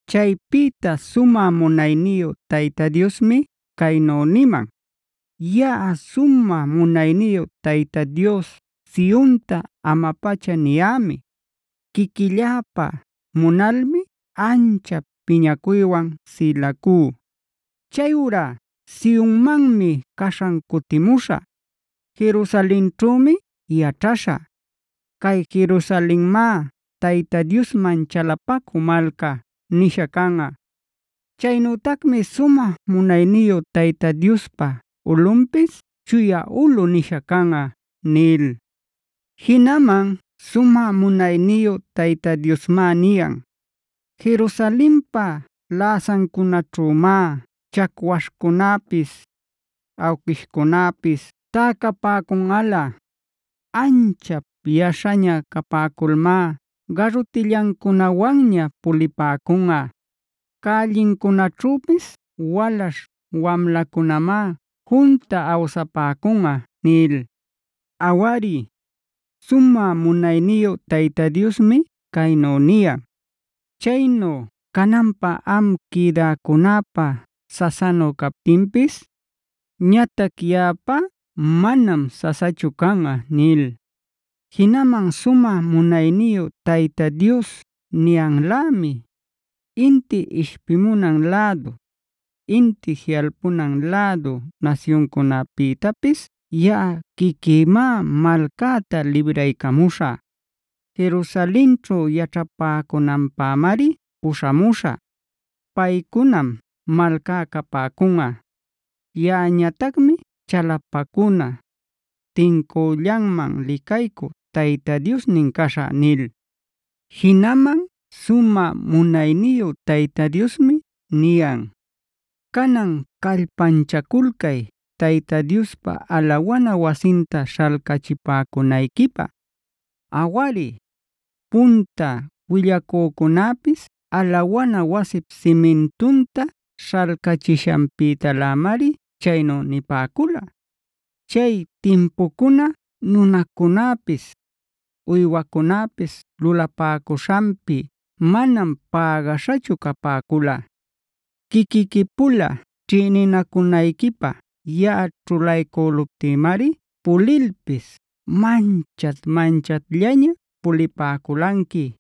Chaypïta sumä munayniyu Tayta Diosmi caynu niman: “Yaꞌa sumä munayniyu Tayta Dios Sionta ama-pacha niyämi; quiquilläpä munalmi anchap piñacuywan sïlacú. Chayurá Sionmanmi caśhan cutimuśhä; Jerusalenćhümi yaćhaśhä. Cay Jerusalenmá ‘Tayta Diosman chalapacü malca’ nisha canꞌa. Chaynütacmi sumä munayniyu Tayta Diospa ulꞌunpis ‘Chuya ulꞌu’ nisha canꞌa” nil. Jinaman sumä munayniyu Tayta Diosmá niyan: “Jerusalenpa läsancunaćhümá chacwaśhcunäpis, awquishcunäpis täcapäcunꞌalä; anchap yaśhaña capäculmá garutillancunawanña pulipäcunꞌa. Cällincunaćhüpis walaśh wamlacunamá junta awsapäcunꞌa” nil. Awari, sumä munayniyu Tayta Diosmi caynu niyan: “Chaynu cananpä am quïdäcunäpä sasanu captinpis, ñatac yaꞌapá manam sasachu canꞌa” nil. Jinaman sumä munayniyu Tayta Dios niyanlämi: “Inti ishpimunan lädu, inti jiꞌalpunan lädu nasyuncunapïtapis yaꞌa quiquïmá malcäta libraycamuśhä. Jerusalenćhu yaćhapäcunanpämari puśhamuśhä. Paycunam malcá capäcunꞌa; yaꞌañatacmi chalapacuna, tincüllanman licaycü Tayta Diosnin caśhä” nil. Jinaman sumä munayniyu Tayta Diosmi niyan: “Canan callpanchaculcay Tayta Diospa alawana wasinta śhalcachipäcunayquipä. Awari, punta willacücunapis alawana wasip simintunta śhalcachishanpïtalämari chaynu nipäcula. Chay timpucuna nunacunäpis, uywacunäpis lulapäcuśhanpi manam pägaśhachu capäcula. Quiquiqui-pula ćhïninacunayquipä yaꞌa ćhulaycüluptïmari pulilpis manchat-manchatllaña pulipäculanqui.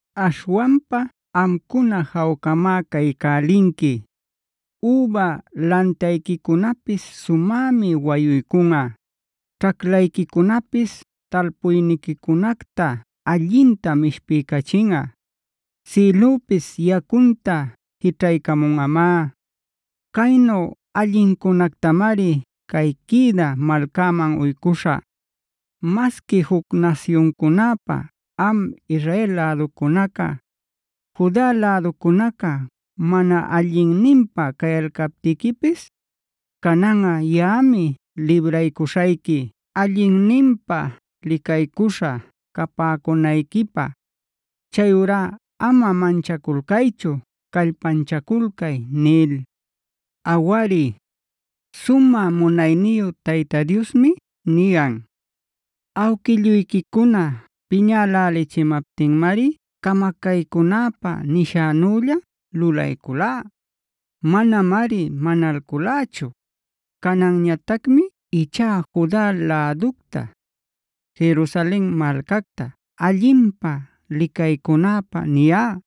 Aśhwanpa amcuna jawcamá caycälinqui. Üba lantayquicunapis sumämi wayuycunꞌa. Ćhaclayquicunapis talpuyniquicunacta allintam ishpiycachinꞌa. Sïlüpis yacunta jićhaycamunꞌamá. Caynu allincunactamari cay quïdä malcaman uycuśhä. Masqui juc nasyuncunäpä am Israel läducunaca, Juda läducunaca mana allinninpä cayalcaptiquipis, cananꞌa yaꞌami libraycuśhayqui allinninpä licaycuśha capäcunayquipä. Chayurá ama manchaculcaychu; callpanchaculcay” nil. Awari, sumä munayniyu Tayta Diosmi niyan: “Awquilluyquicuna piñälälichimaptinmari camacaycünäpä nishänülla lulayculá; manamari manalculächu. Cananñatacmi ichá Juda läducta, Jerusalen malcacta allinpä licaycunäpä niyá.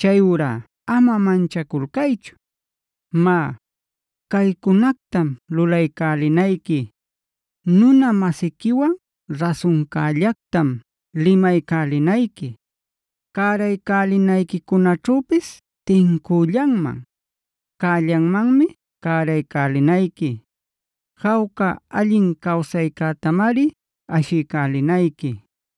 Chayurá ama manchaculcaychu. Má, caycunactam lulaycälinayqui: Nuna-masiquiwan rasuncällactam limaycälinayqui; cäraycälinayquicunaćhüpis tincüllanman, cällanmanmi cäraycälinayqui. Jawca allin cawsaycätamari ashiycälinayqui.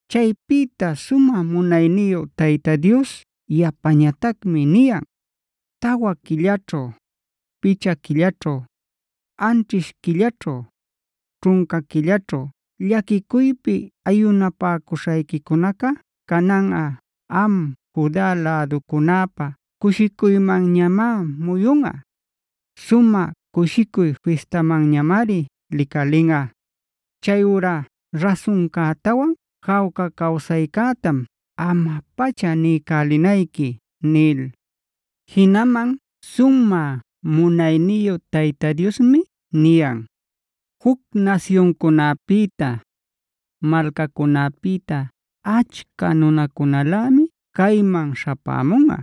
Chaypïta sumä munayniyu Tayta Dios yapañatacmi niyan: “Tawa quillaćhu, picha quillaćhu, anćhish quillaćhu, ćhunca quillaćhu llaquicuypi ayunapäcuśhayquicunaca cananꞌa am Juda läducunäpä cushicuymanñamá muyunꞌa; sumä cushicuy fistamanñamari licalinꞌa. Chayurá rasuncätawan jawca cawsaycätam ama-pacha niycälinayqui” nil. Jinaman sumä munayniyu Tayta Diosmi niyan: “Juc nasyuncunäpïta, malcacunäpïta achca nunacunalämi cayman śhapämunꞌa.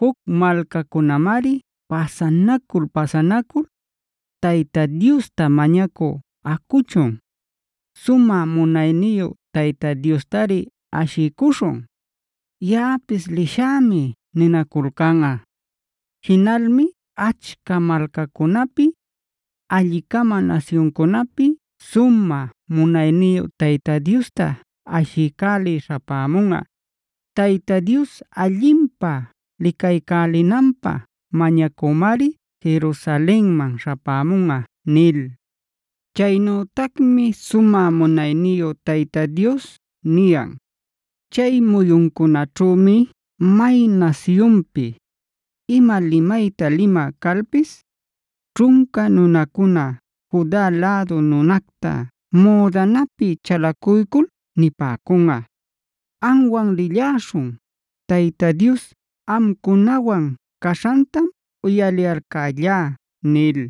Juc malcacunamari pasanacul-pasanacul: ‘Tayta Diosta mañacü acuchun. Sumä munayniyu Tayta Diostari ashiycuśhun. Yaꞌapis lishämi’ ninaculcanꞌa. Jinalmi achca malcacunapi, alli-cama nasyuncunapi sumä munayniyu Tayta Diosta ashiycälï śhapämunꞌa. Tayta Dios allinpä licaycälinanpä mañacümari Jerusalenman śhapämunꞌa” nil. Chaynütacmi sumä munayniyu Tayta Diosmi niyan: “Chay muyuncunäćhümi may nasyunpi, ima limayta limä calpis, ćhunca nunacuna Juda lädu nunacta müdanapi chalacuycul nipäcunꞌa: ‘Amwan lilläśhun; Tayta Dios amcunawan caśhantam uyaliyalcällá’” nil.